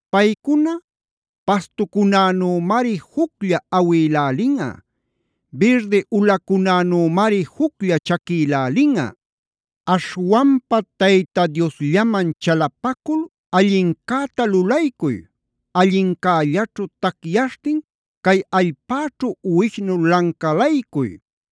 Paycuna pastucunänümari juclla awïlälinꞌa. Birdi ulacunänümari juclla chaquilälinꞌa. Aśhwanpa Tayta Diosllaman chalapacul allincäta lulaycuy. Allincällaćhu tacyaśhtin cay allpäćhu uwishnu lancalaycuy.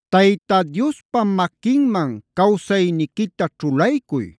Tayta Diospa maquinman cawsayniquita ćhulaycuy.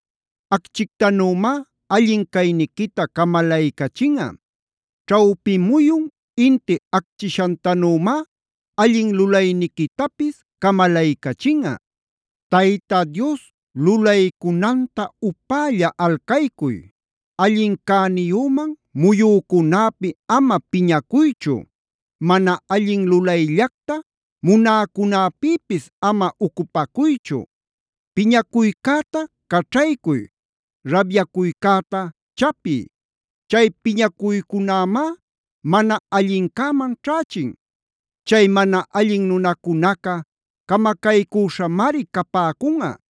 Acchictanümá allin cayniquita camalaycachinꞌa. Ćhawpi muyun inti acchishantanümá allin lulayniquitapis camalaycachinꞌa. Tayta Dios lulaycunanta upälla alcaycuy. Allin cäniyüman muyücunäpi ama piñacuychu; mana allin lulayllacta munäcunäpïpis ama ucupacuychu. Piñacuycäta caćhaycuy, rabyacuycäta chapiy. Chay piñacuycunämá mana allincäman ćhächin. Chay mana allin nunacunaca camacaycüśhamari capäcunꞌa.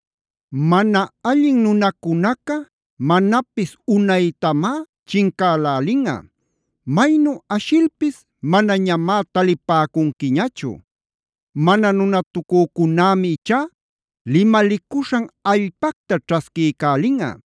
Mana allin nunacunaca manapis unaytamá chincälälinꞌa. Maynu ashilpis manañamá talipäcunquiñachu. Mana nunatucücunämi ichá limalicuśhan allpacta ćhasquiycälinꞌa.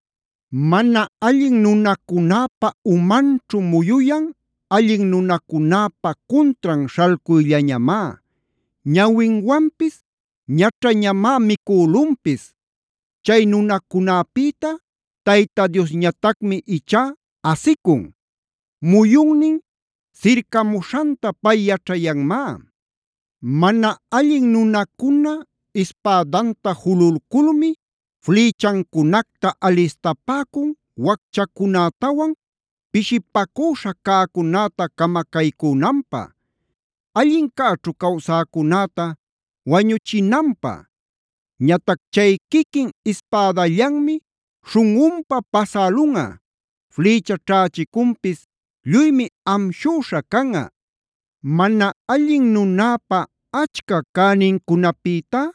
Mana allin nunacunäpa umanćhu muyuyan allin nunacunäpa cuntran śhalcuyllañamá. Ñawinwanpis ñaćhañamá micülunpis. Chay nunacunäpïta Tayta Diosñatacmi ichá asicun. Muyunnin sircamuśhanta pay yaćhayanmá. Mana allin nunacuna ispädanta jululculmi flïchancunacta alistapäcun wacchacunätawan pishipacüśha cäcunäta camacaycünanpä; allincäćhu cawsäcunäta wañüchinanpä. Ñatac chay quiquin ispädallanmi śhunꞌunpa pasälunꞌa. Flïcha ćhächicunpis lluymi amshüśha canꞌa. Mana allin nunäpa achca cänincunapïtá,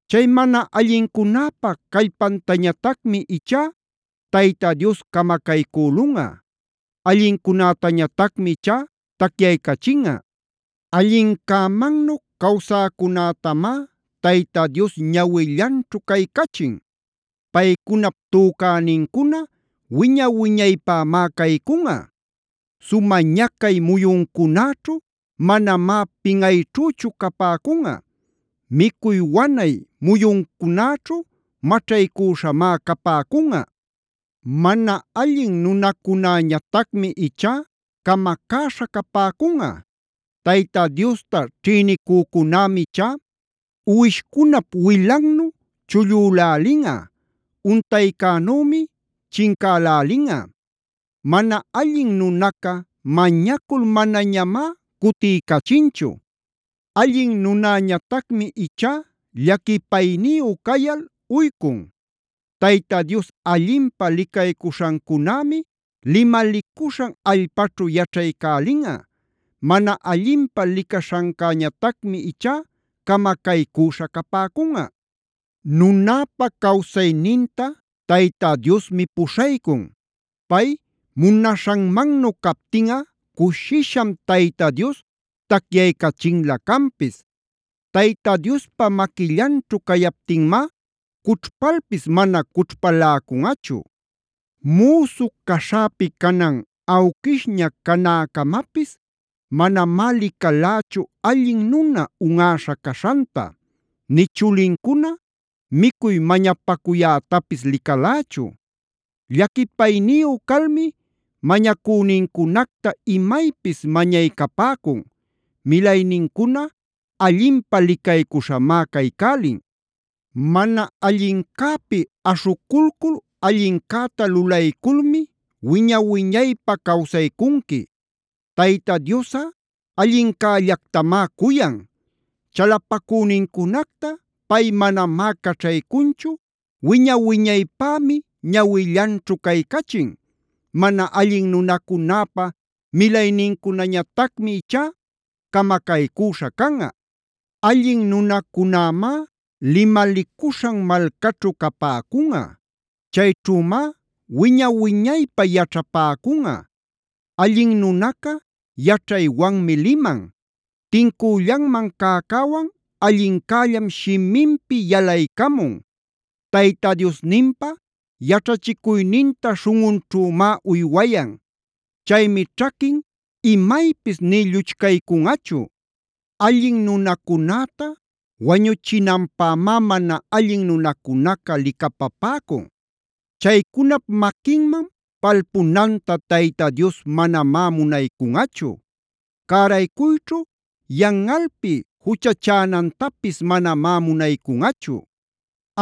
Chay mana allincunäpa callpantañatacmi ichá Tayta Dios camacaycülunꞌa. Allincunätañatacmi ichá tacyaycachinꞌa. Allincämannu cawsäcunätamá Tayta Dios ñawillanćhu caycachin; paycunap tücänincuna wiña-wiñaypämá caycunꞌa. Sumä ñacay muyuncunäćhu manamá pinꞌayćhüchu capäcunꞌa. Micuy wanay muyuncunäćhu maćhaycüśhamá capäcunꞌa. Mana allin nunacunäñatacmi ichá camacäśha capäcunꞌa; Tayta Diosta ćhïnicücunämi ichá uwishcunap wilannu chullülälinꞌa; untaycänümi chincälälinꞌa. Mana allin nunaca mañacul manañamá cutiycachinchu. Allin nunäñatacmi ichá llaquipayniyu cayal uycun. Tayta Dios allinpä licaycuśhancunämi limalicuśhan allpaćhu yaćhaycälinꞌa. Mana allinpä licaśhancäñatacmi ichá camacaycüśha capäcunꞌa. Nunäpa cawsayninta Tayta Diosmi puśhaycun.f Pay munaśhanmannu captinꞌa cushisham Tayta Dios tacyaycachinlä canpis. Tayta Diospa maquillanćhu cayaptinmá cućhpalpis mana cućhpaläcunꞌachu. Müsu caśhäpi canan awquishña canäcamapis manamá licalächu allin nuna unꞌäśha caśhanta; nï chulincuna micuy mañapacuyätapis licalächu. Llaquipayniyu calmi mañacünincunacta imaypis mañaycapäcun. Milaynincuna allinpä licaycuśhamá caycälin. Mana allincäpi aśhuculcul allincäta lulayculmi wiña-wiñaypä cawsaycunqui. Tayta Diosꞌa allincällactamá cuyan.g Chalapacünincunacta pay manamá caćhaycunchu, wiña-wiñaypämi ñawillanćhu caycachin. Mana allin nunacunäpa milaynincunañatacmi ichá camacaycüśha canꞌa. Allin nunacunämá limalicuśhan malcaćhu capäcunꞌa. Chayćhümá wiña-wiñaypä yaćhapäcunꞌa. Allin nunaca yaćhaywanmi liman. Tincüllanman cäcäwan allincällam shiminpi yalaycamun. Tayta Diosninpa yaćhachicuyninta śhunꞌunćhümá uywayan. Chaymi ćhaquin imaypis nï lluchcaycunꞌachu. Allin nunacunäta wañuchinanpämá mana allin nunacunaca licapapäcun. Chaycunap maquinman palpunanta Tayta Dios manamá munaycunꞌachu. Cäraycuyćhu yanꞌalpi juchachänantapis manamá munaycunꞌachu.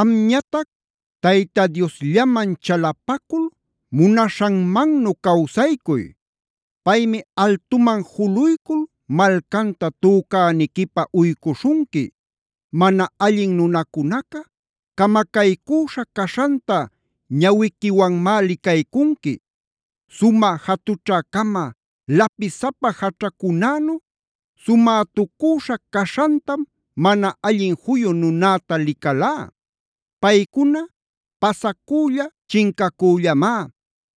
Amñatac Tayta Diosllaman chalapacul munaśhanmannu cawsaycuy. Paymi altuman juluycul malcanta tücäniquipä uycuśhunqui. Mana allin nunacunaca camacaycüśha caśhanta ñawiquiwanmá licaycunqui. Sumä jatućhä-cama lapisapa jaćhacunänu sumätucüśha caśhantam mana allin juyu nunäta licalá. Paycuna pasacülla chincacüllamá.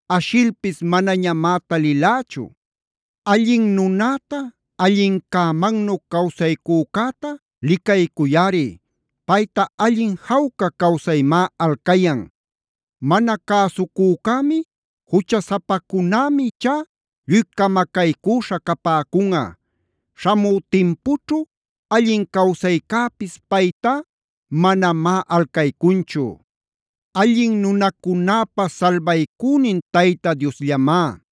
Ashilpis manañamá talilächu. Allin nunäta, allincämannu cawsaycücäta licaycuyꞌari. Payta allin jawca cawsaymá alcayan. Mana cäsucücämi juchasapacunämi ichá lluy camacaycüśha capäcunꞌa. Śhamü timpućhu allin cawsaycäpis paytá manamá alcaycunchu. Allin nunacunäpa salbaycünin Tayta Diosllamá.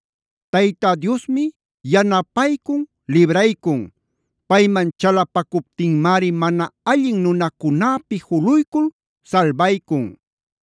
Tayta Diosmi yanapaycun libraycun; payman chalapacuptinmari mana allin nunacunäpi juluycul salbaycun.